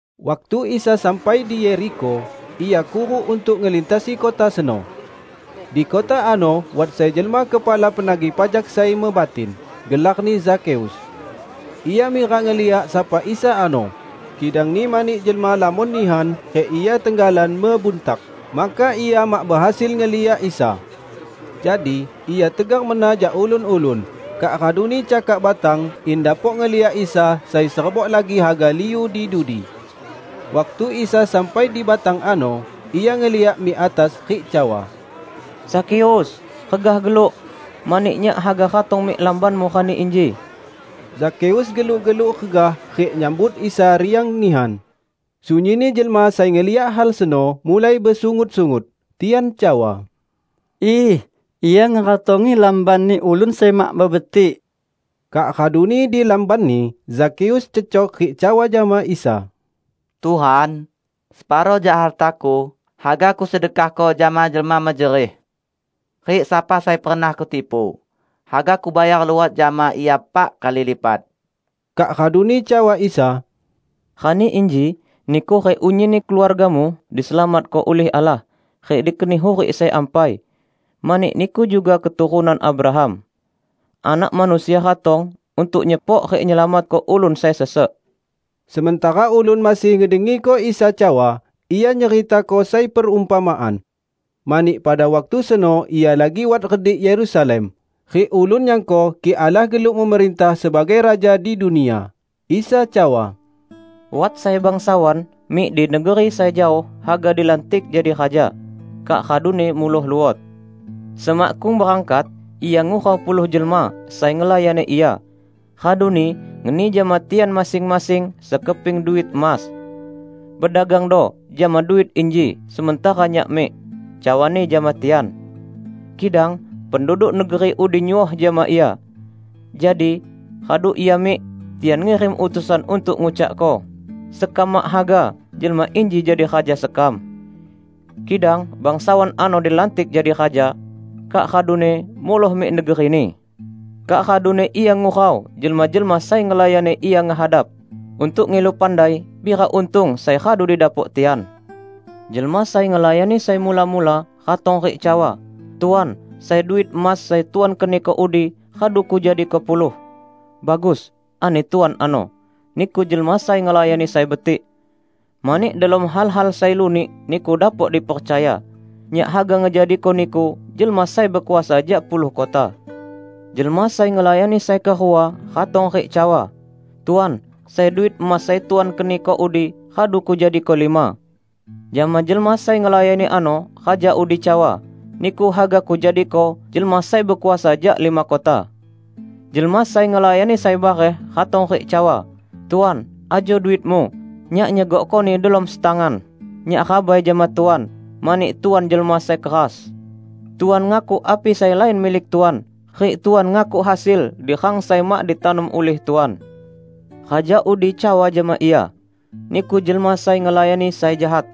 Waktu Isa sampai di Yerikho, Ia kuruk untuk ngelintasi kota seno. Di kota ano wat sai jelma kepala penagih pajak sai mebatin. Gelarni Zakheus. Ia mirak ngeliak sapa Isa ano, kidangni mani jelma lamon nihan rik ia tenggalan mebuntak, maka ia mak behasil ngeliak Isa. Jadi, ia tegar mena jak ulun-ulun, kak raduni cakak batang in dapok ngeliak Isa sai serebok lagi haga liu di dudi. Waktu Isa sampai di batang ano, Ia ngeliak mik atas rik cawa, "Zakheus, regah geluk! Mani Nyak haga ratong mik lambanmu rani inji." Zakheus geluk-geluk regah rik nyambut Isa riang nihan. Sunyinni jelma sai ngeliak hal seno mulai besungut-sungut. Tian cawa, "Iih! Ia ngeratongi lambanni ulun sai mak mebetik!" Kak raduni di lambanni, Zakheus cecok rik cawa jama Isa, "Tuhan, separo jak hartaku haga kusedekahko jama jelma mejerih; rik sapa sai pernah kutipu, haga kubayar luot jama ia pak kali lipat!" Kak raduni cawa Isa, "Rani inji niku rik unyinni keluargamu diselamatko ulih Allah rik dikeni hurik sai ampai, mani niku juga keturunan Abraham. Anak Manusia ratong untuk nyepok rik nyelamatko ulun sai sesek." Sementara ulun masih ngedengiko Isa cawa, Ia nyeritako sai perumpamaan. Mani, pada waktu seno Ia lagi wat redik Yerusalem, rik ulun nyangko kik Allah geluk memerintah sebagai Raja di dunia. Isa cawa, "Wat sai bangsawan mik di negeri sai jaoh haga dilantik jadi raja, kak raduni muloh luot. Semakkung berangkat, ia ngurau puluh jelma sai ngelayani ia, raduni ngeni jama tian masing-masing sekeping duit emas. 'Bedagangdo jama duit inji sementara nyak mik,' cawani jama tian. Kidang penduduk negeri udi nyuoh jama ia. Jadi, radu ia mik, tian ngirim utusan untuk ngucakko, 'Sekam mak haga jelma inji jadi raja sekam.' Kidang bangsawan ano dilantik jadi raja, kak raduni muloh mik negerini. Kak raduni ia ngurau jelma-jelma sai ngelayani ia ngehadap, untuk ngilu pandai pira untung sai radu didapok tian. Jelma sai ngelayani sai mula-mula ratong rik cawa, 'Tuan, sai duit emas sai Tuan keniko udi, radu kujadiko puluh.' 'Bagus,' ani tuan ano, 'niku jelma sai ngelayani sai betik! Mani delom hal-hal sai lunik niku dapok dipercaya, nyak haga ngejadiko niku jelma sai bekuasa jak puluh kota.' Jelma sai ngelayani sai kerua ratong rik cawa, 'Tuan, sai duit emas sai Tuan keniko udi, radu kujadiko lima.' Jama jelma sai ngelayani ano raja udi cawa, 'Niku haga kujadiko jelma sai bekuasa jak lima kota.' Jelma sai ngelayani sai bareh ratong rik cawa, 'Tuan, ajo duitmu; nyak nyegokkoni delom setangan. Nyak rabai jama Tuan, mani Tuan jelma sai keras. Tuan ngakuk api sai lain milik Tuan, rik Tuan ngakuk hasil di rang sai mak ditanom ulih Tuan.' Raja udi cawa jama ia, 'Niku jelma sai ngelayani sai jahat!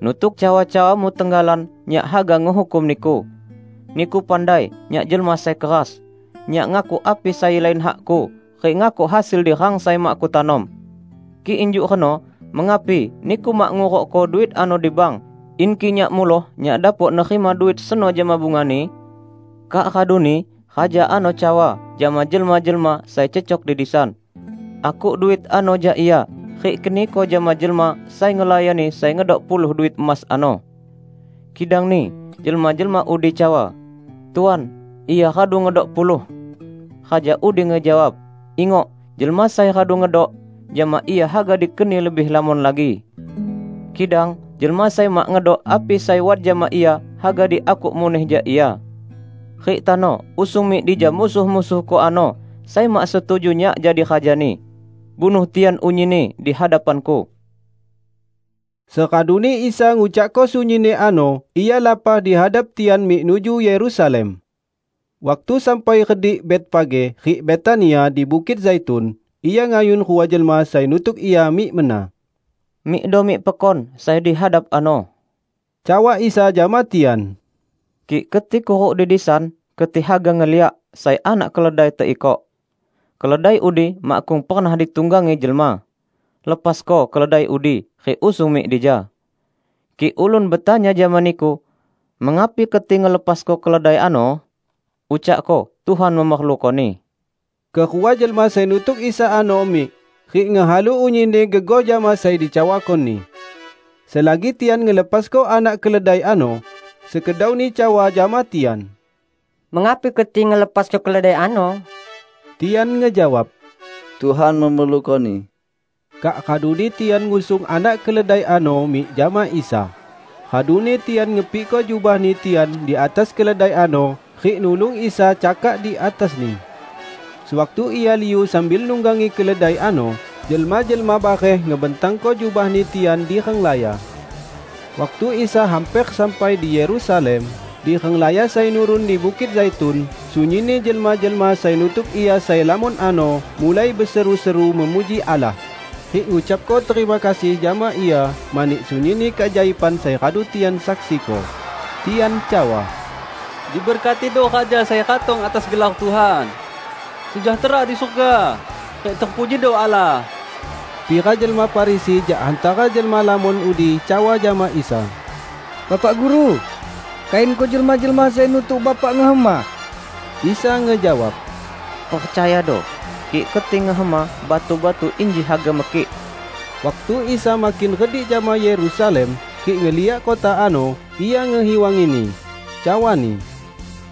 Nutuk cawa-cawamu tenggalan nyak haga ngehukum niku. Niku pandai nyak jelma sai keras: nyak ngakuk api sai lain hakku rik ngakuk hasil di rang sai mak kutanom. Kik injuk reno mengapi niku mak ngurukko duit ano di bank in kik nyak muloh nyak dapok nerima duit seno jama bungani?' Kak raduni raja ano cawa jama jelma-jelma sai cecok di disan, 'Akuk duit ano jak ia rik keniko jama jelma sai ngelayani sai ngedok puluh duit emas ano.' Kidangni jelma-jelma udi cawa, 'Tuan, ia radu ngedok puluh.' Raja udi ngejawab, 'Ingok: jelma sai radu ngedok, jama ia haga dikeni lebih lamon lagi. Kidang jelma sai mak ngedok api sai wat jama ia haga diakuk muneh jak ia. Rik tano usung mik dija musuh-musuhku ano sai mak setuju nyak jadi rajani. Bunuh tian unyinni di hadapanku!' " Seraduni Isa ngucakko sunyinni ano Ia lapah di hadap tian mik nuju Yerusalem. Waktu sampai redik Betfage rik Betania di Bukit Zaitun, Ia ngayun rua jelma sai nutuk Ia mik mena. "Mikdo mik pekon sai di hadap ano," cawa Isa jama tian, "kik keti kuruk di disan, keti haga ngeliak sai anak keledai teikok. Keledai udi makkung pernah ditunggangi jelma. Lepasko keledai udi rik usung mik dija. Kik ulun betanya jama niku, 'Mengapi keti ngelepasko keledai ano?' ucakko, 'Tuhan memerlukoni.' " Kerua jelma sai nutuk Isa ano mik, rik ngehalu unyinni gegoh jama sai dicawako-Ni. Selagi tian ngelepasko anak keledai ano, sekedauni cawa jama tian, "Mengapi keti ngelepasko keledai ano?" Tian ngejawab, "Tuhan memerlukoni." Kak raduni tian ngusung anak keledai ano mik jama Isa. Raduni tian ngepikko jubahni tian di atas keledai ano rik nulung Isa cakak di atasni. Sewaktu Ia liu sambil nunggangi keledai ano, jelma-jelma bareh ngebentangko jubahni tian di renglaya. Waktu Isa hamper sampai di Yerusalem, di renglaya sai nurun di Bukit Zaitun, sunyinni jelma-jelma sai nutuk Ia sai lamon ano mulai beseru-seru memuji Allah rik ngucapko terima kasih jama Ia mani sunyinni keajaiban sai radu tian saksiko. Tian cawa, "Diberkatido Raja sai ratong atas gelar Tuhan! Sejahtera di surga, rik terpujido Allah!" Pira jelma Farisi jak hantara jelma lamon udi cawa jama Isa, "Bapak Guru, kayunko jelma-jelma sai nutuk Bapak ngehema." Isa ngejawab, "Percayado! Kik keti ngehema, batu-batu inji haga mekik." Waktu Isa makin redik jama Yerusalem, rik ngeliak kota ano, Ia ngehiwangini. Cawa-Ni,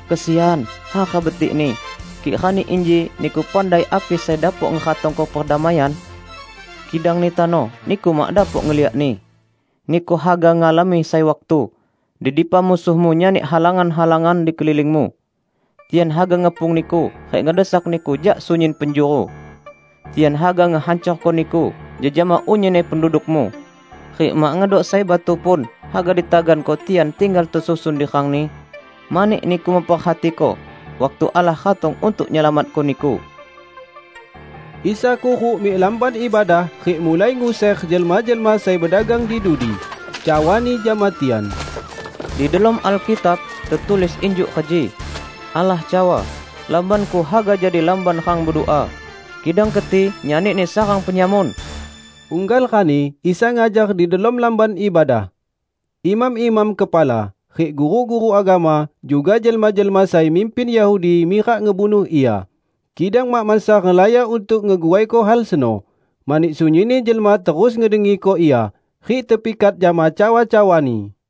"Kesian, hara betikni, kik rani inji niku pandai api sai dapok ngeratongko perdamaian! Kidangni tano niku mak dapok ngeliakni. Niku haga ngalami sai waktu, di dipa musuhmu nyani halangan-halangan di kelilingmu; tian haga ngepung niku rik ngedesak niku jak sunyin penjuru. Tian haga ngehancorko niku jejama unyinni pendudukmu; rik mak ngedok sai batu pun haga ditaganko tian tinggal tesusun di rangni, mani niku memperhatiko waktu Allah ratong untuk nyelamatko niku!" Isa kuruk mik Lamban Ibadah rik mulai nguser jelma-jelma sai bedagang di dudi. Cawa-Ni jama tian, "Di delom Alkitab tetulis injuk reji: Allah cawa, 'Lamban-Ku haga jadi lamban rang bedua.' Kidang keti nyanini sarang penyamun!" Unggal rani Isa ngajar di delom Lamban ibadah. Imam-imam kepala, rik guru-guru agama, juga jelma-jelma sai mimpin Yahudi mirak ngebunuh Ia, kidang mak mansa renglaya untuk ngeguaiko hal seno, mani sunyinni jelma terus ngedengiko Ia, rik tepikat jama cawa-cawa-Ni.